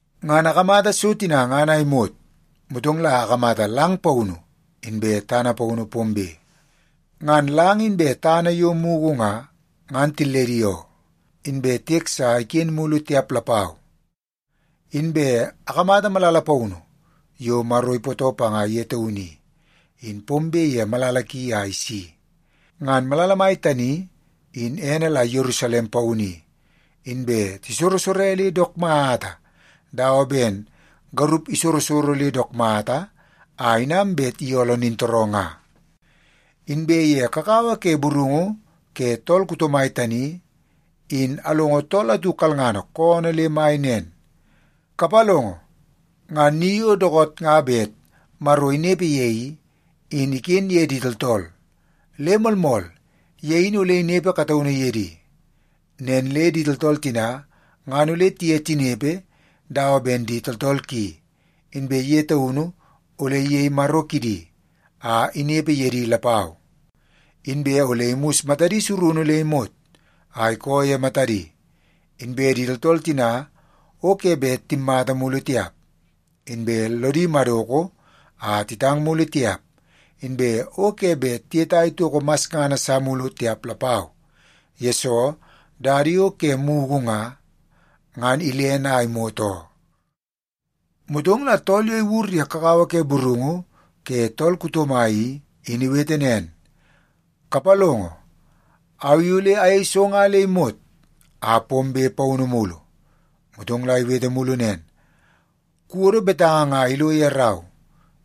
Ngan akamata so tina ngan a imot, motong la akamata lang paunu inbe tana paunu pombe. Ngan lang inbe tana yo mugu nga, ngan tilledi oo, inbe tiek sa iken mulu tiap lapau. Inbe akamata malala paunu yo Maro ipootoo panga ye taunu i, in pombe ye malala ki a isi. Ngan malala mai tani in ene la Yerusalem Paunu i, inbe tisorosore le dook mata dawa ben garup isorosoro le dook mata a inam bet iyooloo nintooroo nga. Inbe ye kakawa ke burungu ke tool kuto mai tani, in alongo tool atu kalngana koonoo le mai nen, “Kapalongo, ngan ni yo dookoot nga bet Maro inepe ye i, in iken ye di tooltool. Le moolmool, ye in ole inepe kataunu ye di. Nen le di tooltool tina ngan ole tiye tinepe dawa ben di tooltool ki, inbe ye taunu ole iyei Maro kidi a inepe ye di lapau. Inbe ole imus matadi surunu le imot a ikoo ye matadi. Inbe di tooltool tina o ke bet timmata mulu tiap, inbe lodi madoko a titang mulu tiap, inbe o ke bet tiyetai toko masngana sa mulu tiap lapau, yesoo dada yo ke mugu nga, ngan ilene a imot oo.” Motong la tool yo iwur ye kakawa ke burungu ke tool kuto mai i, in iwete nen, “Kapalongo, au i ole ayei so nga le imot a pombe paunu mulu!” Motong la iwete mulu nen, “Kuwodo betanga nga ilo ye rau,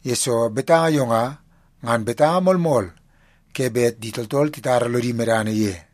yesoo betanga yo nga, ngan betanga moolmool ke bet di tooltool titara lodi medana ye.”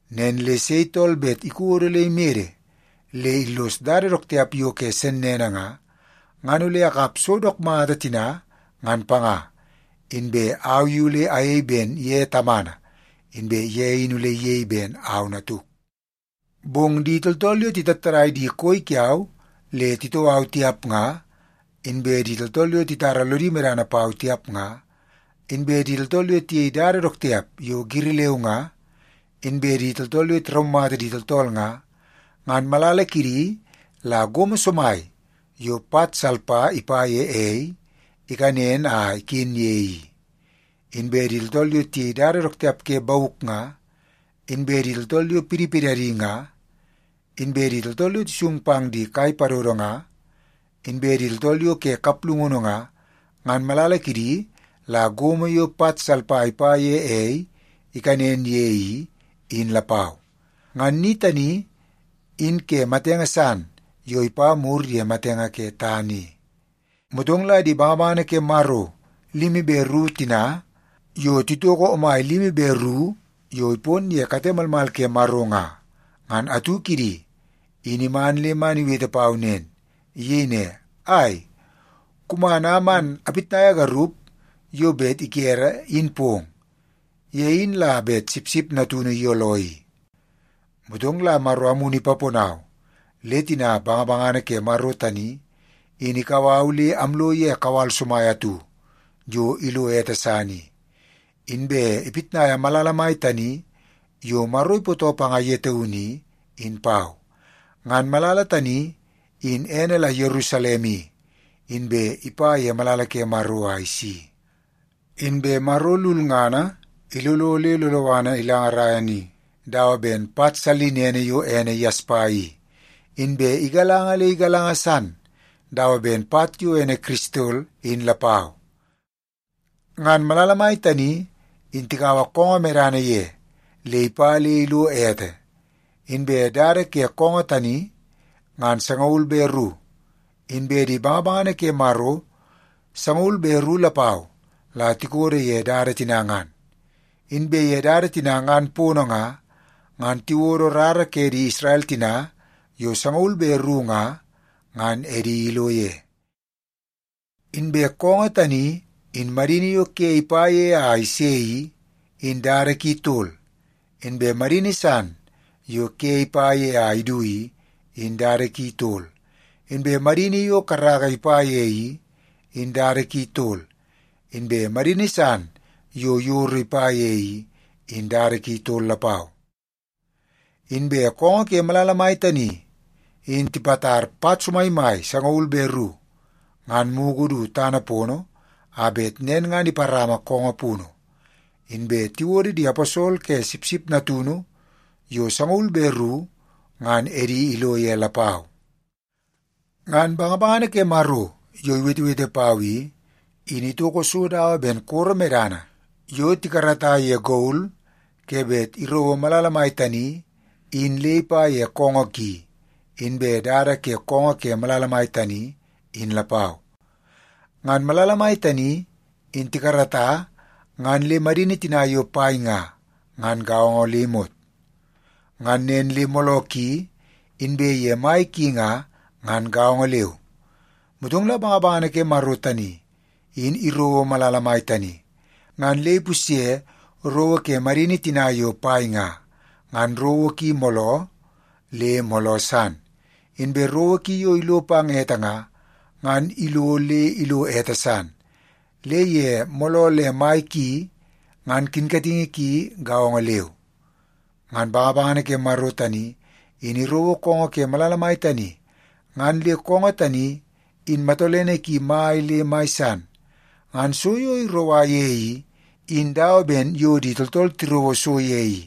Nen le sei tool bet ikodo le imede le illos dada dook tiap yo ke sennene nga, ngan ole akap so dook mata tina ngan panga. Inbe au i ole ayei ben ye Tamana, inbe ye in ole iyei ben au Natuk. Bong di tooltool yo titattadai di koi kiau le titoo au tiap nga, inbe di tooltool yo titara lodi medana pau tiap nga, inbe di tooltool yo tiyei dada dook tiap yo giri leu nga, inbe di tooltool yo tiraumata di tooltool nga, ngan malala kidi la gomo somai yo pat salpa ipa ye ei ikanen a iken ye i. Inbe di tooltool yo tiyei dada dook tiap ke bauk nga, inbe di tooltool yo pidipidadi nga, inbe di tooltool yo tisung pang di kai padodo nga, inbe di tooltool yo ke kaplungunu nga, ngan malala kidi la gomo yo pat salpa ipa ye ei ikanen ye i, in lapau. Ngan ni tani in ke matenge san yo ipa mur ye matenge ke tana i.” Motong la di bangabangana ke Maro limi be ru tina yo titoko omai limi be ru yo ipon ye kate malmal ke Maro nga, ngan atu kidi in iman le man iwete pau nen. Iyei ne, “Ai, kuman a man apitnaia garup yo bet ikere, in pong. Ye in la bet Sipsip Natunu iyooloo i.” Motong la Maro Amunu ipaponau le tina bangabangana ke Maro tani in ikau au le amlo ye kawal somai atu yo ilo ete san i, inbe ipitnaia malala mai tani yo Maro ipootoo panga ye taunu i, in pau. Ngan malala tani in ene la Yerusalem i, inbe ipa ye malala ke Maro a isi. Inbe Maro lulngana ilolo le loloana ilangarai ni dawa ben pat sallinene yo ene yaspa i, inbe igalanga le igalanga san dawa ben pat yo ene kiristol in lapau. Ngan malala mai tani in tikaua koongoo medana ye le ipa le ilo ete. Inbe dada ke koongoo tani ngan sangaul be ru, inbe di bangabangana ke Maro sangaul be ru lapau la tikodo ye dada tina ngan. Inbe ye dada tina ngan pono nga, ngan tiwodo rara ke di Isrel tina yo sangaul be ru nga, ngan edi ilo ye. Inbe koongoo tani in madini yo ke ipa ye a ise i, in dada ki tol. Inbe madini san yo ke ipa ye a idu i, in dada ki tol. Inbe madini yo karaka ipa ye i, in dada ki tol. Inbe madini san yo yoro ipa ye i, in dada ki tol lapau. Inbe koongoo ke malala mai tani, in tipatar pat somaimai sangaul be ru ngan mugu du tana pono a bet nen ngan iparama koongoo punu. Inbe tiwodo di aposol ke Sipsip Natunu yo sangaul be ru ngan edi ilo ye lapau. Ngan bangabangana ke Maro yo iwetewete pau i, in itoko so dawa ben koro medana yo tikarata ye gol ke bet irouo malala mai tani in le ipa ye koongoo ki, inbe dada ke koongoo ke malala tani in lapau. Ngan malala mai tani in tikarata ngan le madini tina yo pai nga, ngan gaongo le imot. Ngan nen le mooloo ki inbe ye mai ki nga, ngan gaongo leu. Motong la bangabangana ke Maro tani in irouo malala mai tani, ngan le ipusye rowo ke madini tina yo pai nga, ngan rowo ki mooloo le mooloo san. Inbe rowo ki yo ilo pang ete nga, ngan ilo le ilo ete san le ye mooloo le mai ki ngan kinkatingi ki gaongo leu. Ngan bangabangana ke Maro tani in irouo koongoo ke malala mai tani, ngan le koongoo tani in matolene ki mai le mai san. Ngan so yo iroua ye i, in dawa ben yo di tooltool tirouo so ye i.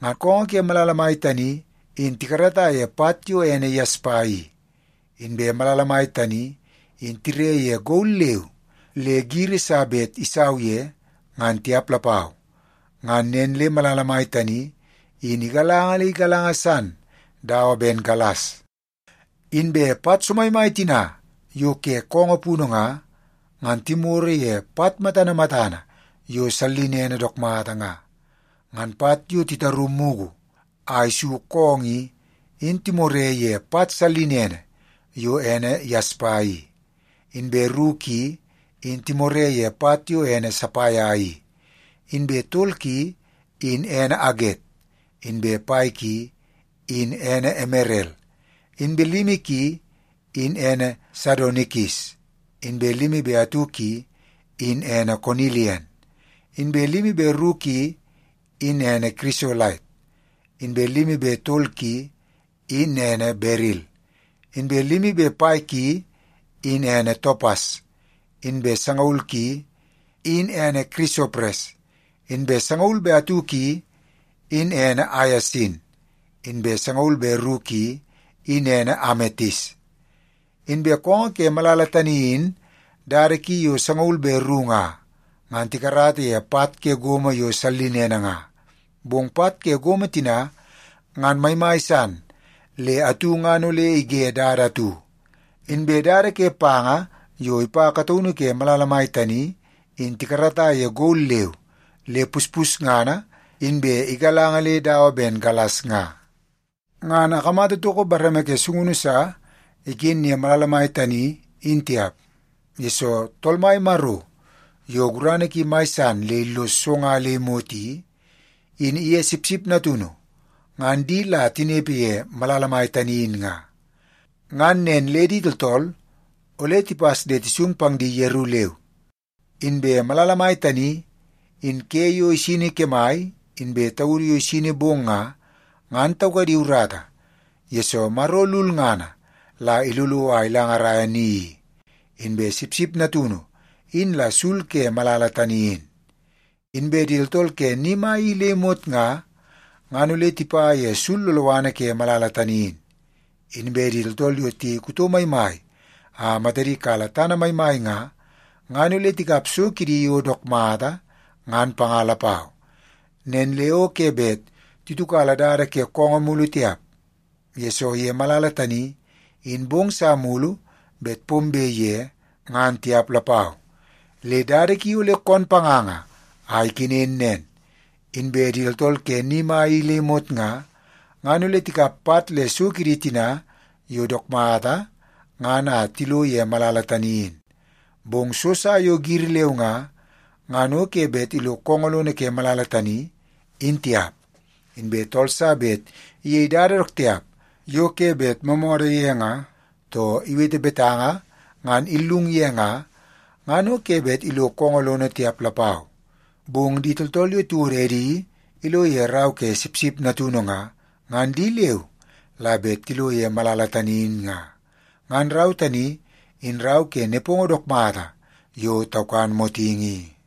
Ngan koongoo ke malala tani in tikarata ye pat yo ene yaspa i. Inbe malala mai in tire ye gol leu le giri sa bet isau ye, ngan tiap lapau. Ngan nen le malala mai tani in igalanga le igalanga san dawa ben galas. Inbe pat somaimai tina yo ke koongoo punu nga, ngan timoro ye pat matana matana yo sallinene dook mata nga. Ngan pat yo titaru mugu a isu koongoo i, in timore ye pat sallinene yo ene yaspa i; inbe ru ki, in timore ye pat yo ene sapaia i; inbe tol ki, in ene aget; inbe pai ki, in ene emerel; inbe limi ki, in ene sadonikis; inbe limi be atu ki, in ene konilian; inbe limi be ru ki, in ene kirisolait; inbe limi be tol ki i, in ene beril; inbe limi be pai ki, in ene topas; inbe sangaul ki, in ene kirisopres; inbe sangaul be atu ki, in ene aiasin; inbe sangaul be ru ki, in ene ametis. Inbe koongoo ke malala tani in dada ki yo sangaul be ru nga, ngan tikarata ye pat ke gomo yo sallinene nga. Bong pat ke gomo tina ngan maimai san le atu ngan ole ige dada atu. Inbe dada ke panga yo ipa kataunu ke malala mai tani in tikarata ye gol leu le puspusngana inbe igalanga le dawa ben galas nga. Ngan akamata toko bareme ke sungunu sa iken ye malala mai tani in tiap, yesoo Tool Mai Maro yo gurana ki mai san le illos so nga le imot i, in iye Sipsip Natunu ngan di la tinepe ye malala mai tani in nga. Ngan nen le di tooltool ole tipas le tisung pang di yeru leu. Inbe malala mai tani in ke yo isini kemai inbe taudu yo isini bong nga, ngan taukadi urata, yesoo Maro lulngana la ilolo a ilangaraia ni i, inbe Sipsip Natunu in la sul ke malala tani in. Inbe di tooltool ke ni mai i le imot nga, ngan ole tipa ye sul loloana ke malala tani in. Inbe di tooltool yo tiyei kuto maimai a matadi kala tana maimai nga, ngan ole tikap so kidi yo dook mata ngan panga lapau. Nen le o ke bet titiukala dada ke koongoo mulu tiap, yesoo ye malala tani in bong sa mulu bet pombe ye ngan tiap lapau. Le dada ki ole koon panganga a ikenen nen. Inbe di tooltool ke ni mai i le imot nga, ngan ole tikap pat le so kidi tina yo dook mata ngan a tilo ye malala tani in. Bong so sa yo giri leu nga, ngan ke bet ilo koongoo lono ke malala tani, in tiap. Inbe tool sa bet iyei dada dook tiap yo ke bet moomoodoo ye nga, too iwete betanga ngan illung ye nga, ngan o ke bet ilo koongoo lono tiap lapau. Bong di tooltool yo tiwodo edi ilo ye rau ke Sipsip Natunu nga, ngan di leu la bet tilo ye malala tani in nga. Ngan rau tani in rau ke nepongo dook mata yo taukan motingi i.